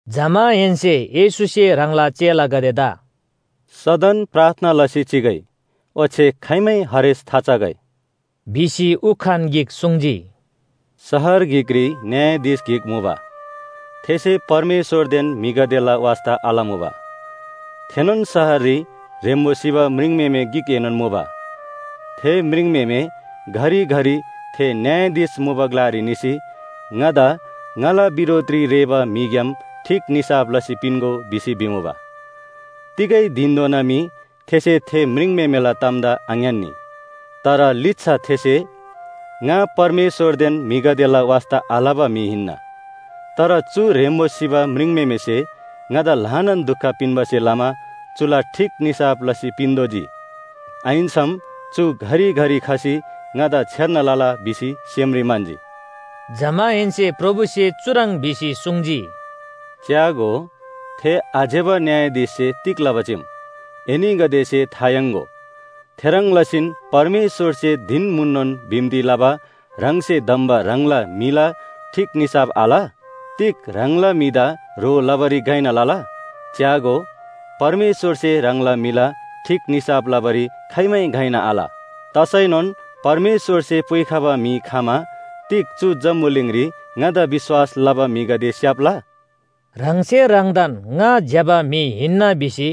जमाहेन्‍से येशूसे ह्राङला चेलागदेदा “सदन प्रार्थना लसी चिगै ओच्‍छे खाइमै हरेस थाचगै” भिसी उखान गिक सुङ्जी। “शहर गिकरी न्‍यायाधीश गिक मुबा। थेसे परमेश्‍वरदेन म्‍हिगदेला वास्‍ता आलमुबा। थेनोन शहररी ह्रेम्‍बो सिबा म्रिङम्‍हेमे गिकएनोन मुबा। थे म्रिङम्‍हेमे घरिघरि थे न्‍यायाधीश मुबा ग्‍लारी निसी ‘ङादा ङाला बिरोधरी रेःबा म्‍हिग्‍याम ठीक निसाफ लसी पिन्‍गो’ भिसी भिमुबा। “तिगै धिनधोना मी थेसे थे म्रिङम्‍हेमेला तामदा आङ्‌यान्‍नी। तर लिच्‍छा थेसे, ‘ङा परमेश्‍वरदेन म्‍हिगदेला वास्‍ता आलबा म्‍हि हिन्‍ना। तर चु ह्रेम्‍बो सिबा म्रिङम्‍हेमेसे ङादा ल्‍हानान दुख पिन्‍बासे लमा चुला ठीक निसाफ लसी पिन्‍तोःजी। आहिन्‍सम चु घरिघरि खसी ङादा छेर्ना लला’ भिसी सेमरी म्‍हन्‍जी।” जमाहेन्‍से प्रभुसे चुह्रङ् भिसी सुङ्जी, “च्‍यागो, थे आज्‍यबा न्‍यायाधीशसे तिग लबा चीम, एनीगदेसे था याङ्‍गो। थेह्रङ् लसीन परमेश्‍वरसे धिन म्‍हुननोन बिन्‍ती लबा ह्राङसे धम्‍बा ह्राङला म्‍हिला ठीक निसाफ आल? तिग ह्राङला म्‍हिदा ह्रो लबारी घइना लला? च्‍यागो, परमेश्‍वरसे ह्राङला म्‍हिला ठीक निसाफ लबारी खाइमै घइना आल। तसैनोन परमेश्‍वरसे पुइखबा म्‍हि खमा तिग चु जम्‍बुलिङरी ङादा विश्‍वास लबागदे स्‍याप्‍ला?” ह्राङसे ह्राङदान ङा ज्‍यबा म्‍हि हिन्‍ना भिसी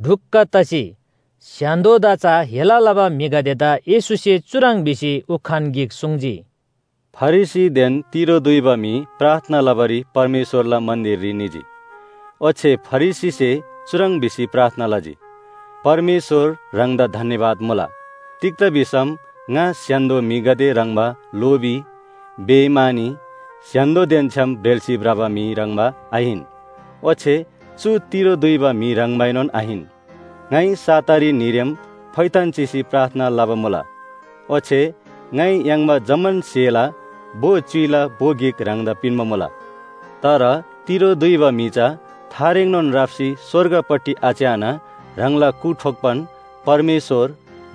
ढुक्‍क तसी स्‍य्‍हान्‍दोदा चा हेला लबा म्‍हिगदेदा येशूसे चुह्रङ् भिसी उखान गिक सुङ्जी, “फरिसीदेन तिरो दुइबा म्‍हि प्रार्थना लबारी परमेश्‍वरला मन्‍दिररी निजी। ओच्‍छे फरिसीसे चुह्रङ् भिसी प्रार्थना लजी, ‘परमेश्‍वर ह्राङदा धन्‍यवाद मुला, तिग्‍दा भिसम ङा स्‍य्‍हान्‍दो म्‍हिगदे ह्रङ्‌बा लोभी, बेइमानी, स्‍य्‍हान्‍दोदेन छ्‌याम ब्रेल्‍सी भ्रबा म्‍हि ह्रङ्‌बा आहिन। ओच्‍छे चु तिरो दुइबा म्‍हि ह्रङ्बाएनोन आहिन। ङाइ सातारी न्‍हीरेम फोइथान चिसी प्रार्थना लबा मुला। ओच्‍छे ङाइ याङ्बा जम्‍मान स्‍हेला भो च्‍युइला भो गिक ह्राङदा पिन्‍बा मुला।’ “तर तिरो दुइबा म्‍हि चा थारेङनोन राप्‍सी स्‍वर्गपट्टि आच्‍याना ह्राङला कु ठोक्‍बान, ‘परमेश्‍वर,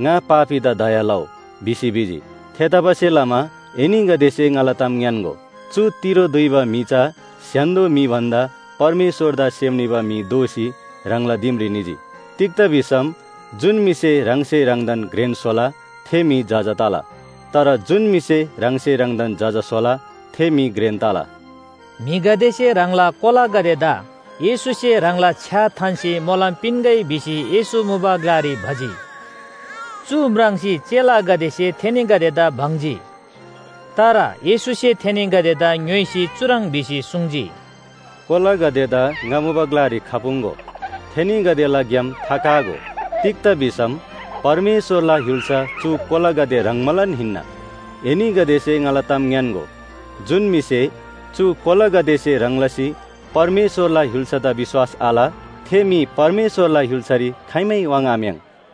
ङा पापीदा दया लउ’ भिसी भिजी। थेतबासेलमा एनीगदेसे ङाला ताम ङ्‌यान्‍गो, चु तिरो दुइबा म्‍हि चा स्‍य्‍हान्‍दो म्‍हि भन्‍दा परमेश्‍वरदा सेम निबा म्‍हि दोसी ह्राङला दिमरी निजी। तिग्‍दा भिसम जुन म्‍हिसे ह्राङसे ह्राङदान घ्रेन स्‍होला थे म्‍हि जजा तला। तर जुन म्‍हिसे ह्राङसे ह्राङदान जजा स्‍होला थे म्‍हि घ्रेन तला।” म्‍हिगदेसे ह्राङला कोलागदेदा येशूसे ह्राङला छ्‌या थान्‍सी मोलम पिन्‍गै भिसी येशू मुबा ग्‍लारी भजी। चु म्राङ्सी चेलागदेसे थेनीगदेदा बङ्जी। तर येशूसे थेनीगदेदा ङ्‌योइसी चुह्रङ् भिसी सुङ्जी, “कोलागदेदा ङा मुबा ग्‍लारी खपुङ्‍गो, थेनीगदेला ग्‍याम थाकागो। तिग्‍दा भिसम परमेश्‍वरला य्‍हुल्‍सा चु कोलागदे ह्रङ्बालान हिन्‍ना। एनीगदेसे ङाला ताम ङ्‌यान्‍गो, जुन म्‍हिसे चु कोलागदेसे ह्रङ् लसी परमेश्‍वरला य्‍हुल्‍सादा विश्‍वास आल, थे म्‍हि परमेश्‍वरला य्‍हुल्‍सारी खाइमै वाङ्‌आम्‍याङ्।”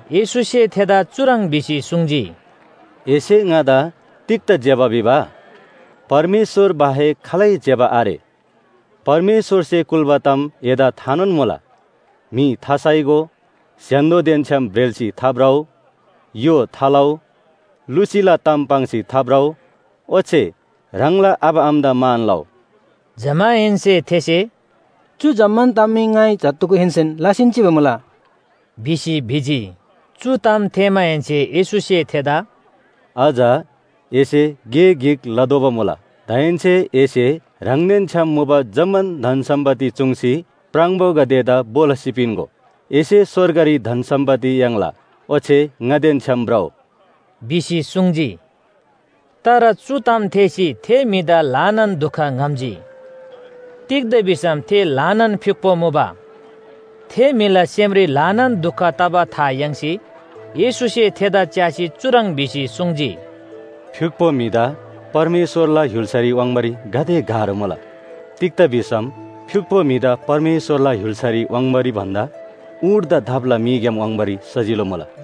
येशूसे थेदा चुह्रङ् भिसी सुङ्जी, “एसे ङादा तिग्‍दा ज्‍यबा भिबा? परमेश्‍वर बाहेक खालै ज्‍यबा आरे। परमेश्‍वरसे कुल्‍बा ताम एदा थानोन मुला। म्‍हि थासाइगो, स्‍य्‍हान्‍दोदेन छ्‌याम ब्रेल्‍सी थाभ्रउ, य्‍हो थालउ, लुसीला ताम पाङ्सी थाभ्रउ ओच्‍छे ह्राङला आबा आमादा मान लउ।” जमाहेन्‍से थेसे, “चु जम्‍मान ताम मी ङाइ जत्‍धुगुहेन्‍सेन लसीन चिबा मुला” भिसी भिजी। चु ताम थेःमाहेन्‍से येशूसे थेदा “अझ एसे गे गिक लतोःबा मुला, दाहेन्‍से एसे ह्राङदेन छ्‌याम मुबा जम्‍मान धन सम्‍पत्ति चूङ्सी प्राङबोगदेदा भो लसी पिन्‍गो। एसे स्‍वर्गरी धन सम्‍पत्ति याङ्ला, ओच्‍छे ङादेन छ्‌याम भ्रउ” भिसी सुङ्जी। तर चु ताम थेःसी थे म्‍हिदा ल्‍हानान दुख ङ्‌हम्‍जी। तिग्‍दा भिसम थे ल्‍हानान फ्‍युक्‍पो मुबा। थे म्‍हिला सेमरी ल्‍हानान दुख तबा था याङ्सी येशूसे चुह्रङ् भिसी सुङ्जी, “थेदा च्‍यासी फ्‍युक्‍पो म्‍हिदा परमेश्‍वरला य्‍हुल्‍सारी वाङ्बारी गाते गाह्रो मुला। तिग्‍दा भिसम फ्‍युक्‍पो म्‍हिदा परमेश्‍वरला य्‍हुल्‍सारी वाङ्बारी भन्‍दा ऊँटदा दापला मीग्‍याम वाङ्बारी सजिलो मुला।”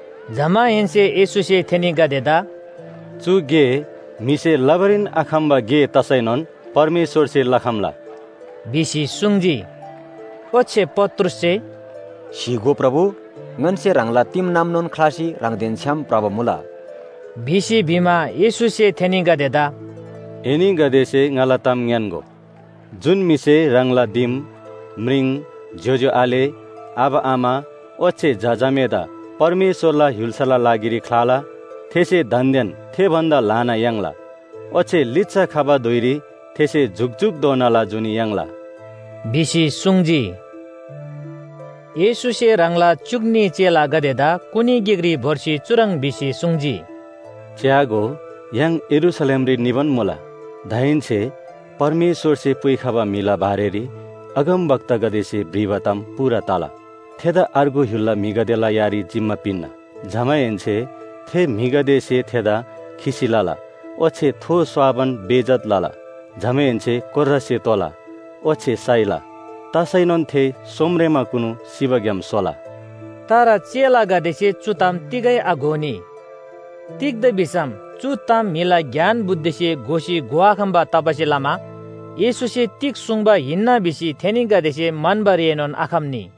जमाहेन्‍से येशूसे थेनीगदेदा “चु गे म्‍हिसे लबारीन आखम्‍बा गे तसैनोन परमेश्‍वरसे लखम्‍ला” भिसी सुङ्जी। ओच्‍छे पत्रुससे, “स्‍हीगो प्रभु, ङन्‍से ह्राङला दिमनामनोन ख्‍लासी ह्राङदेन छ्‌याम भ्रबा मुला” भिसी भिमा, येशूसे थेनीगदेदा “एनीगदेसे ङाला ताम ङ्‌यान्‍गो, जुन म्‍हिसे ह्राङला दिम, म्रिङ, ज्‍योज्‍यो आले, आबा आमा, ओच्‍छे झा झामेदा परमेश्‍वरला य्‍हुल्‍साला लागिरी ख्‍लाला, थेसे दान्‍देन थे भन्‍दा ल्‍हाना याङ्ला, ओच्‍छे लिच्‍छा खबा धुइरी थेसे जुकजुकधोनाला जुनी याङ्ला” भिसी सुङ्जी। येशूसे ह्राङला च्‍युक न्‍ही चेलागदेदा कुनी गिकरी भोर्सी चुह्रङ् भिसी सुङ्जी, “च्‍यागो, य्‍हाङ यरूशलेमरी निबान मुला। दाहेन्‍से परमेश्‍वरसे पुइखबा म्‍हिला बारेरी अगमवक्तागदेसे भ्रिबा ताम पूरा तला। थेदा अर्गु य्‍हुलला म्‍हिगदेला यारी जिम्‍मा पिन्‍ना। जमाहेन्‍से थे म्‍हिगदेसे थेदा खिसी लला ओच्‍छे थो स्‍वाबान बेइज्‍जत लला, जमाहेन्‍से कोर्रासे तोला ओच्‍छे साइला। तसैनोन थे सोमरेमाकुनु सिबाग्‍याम सोला।” तर चेलागदेसे चु ताम तिगै आघोनी। तिग्‍दा भिसम चु ताम म्‍हिला ज्ञान बुद्धिसे घोसी घोआखम्‍बा तबासे लमा येशूसे तिग सुङ्बा हिन्‍ना भिसी थेनीगदेसे म्‍हन्‍बारीएनोन आखम्‍नी।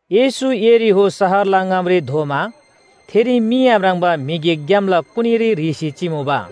येशू यरीहो शहरला ङामरी धोमा थेरी मी आम्राङ्बा म्‍हि गिक ग्‍यामला कुनीरी ह्रीसी चिमुबा।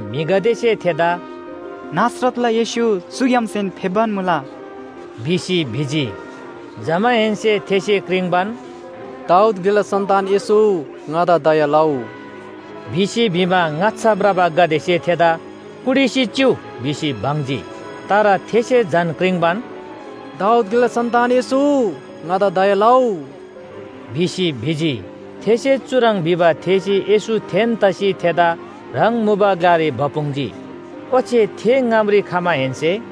म्‍हिगदेसे थेदा “नासरतला येशू चुग्‍यामसेन फेप्‍बान मुला” भिसी भिजी। जमाहेन्‍से थेसे क्रिङ्बान, “दाऊद ग्‍लेला सन्‍तान येशू, ङादा दया लउ” भिसी भिमा, ङाच्‍छा भ्रबागदेसे थेदा कुटिसी चिउ भिसी बङ्जी। तर थेसे झन क्रिङ्बान, “दाऊद ग्‍लेला सन्‍तान येशू, ङादा दया लउ” भिसी भिजी। थेसे चुह्रङ् भिबा थेःसी येशू थेन तसी थेदा ह्राङ मुबा ग्‍लारी भपुङ्जी। ओच्‍छे थे ङामरी खमाहेन्‍से,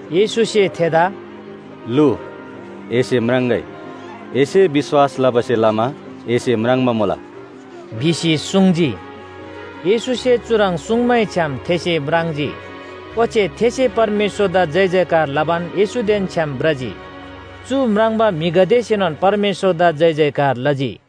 येशूसे थेदा “लु, एसे म्राङ्‍गै, एसे विश्‍वास लबासे लमा एसे म्राङ्बा मुला” भिसी सुङ्जी। येशूसे चुह्रङ् सुङ्मैछ्‌याम थेसे म्राङ्जी। ओच्‍छे थेसे परमेश्‍वरदा जयजयकार लबान येशूदेन छ्‌याम भ्रजी। चु म्राङ्बा म्‍हिगदेसेनोन परमेश्‍वरदा जयजयकार लजी।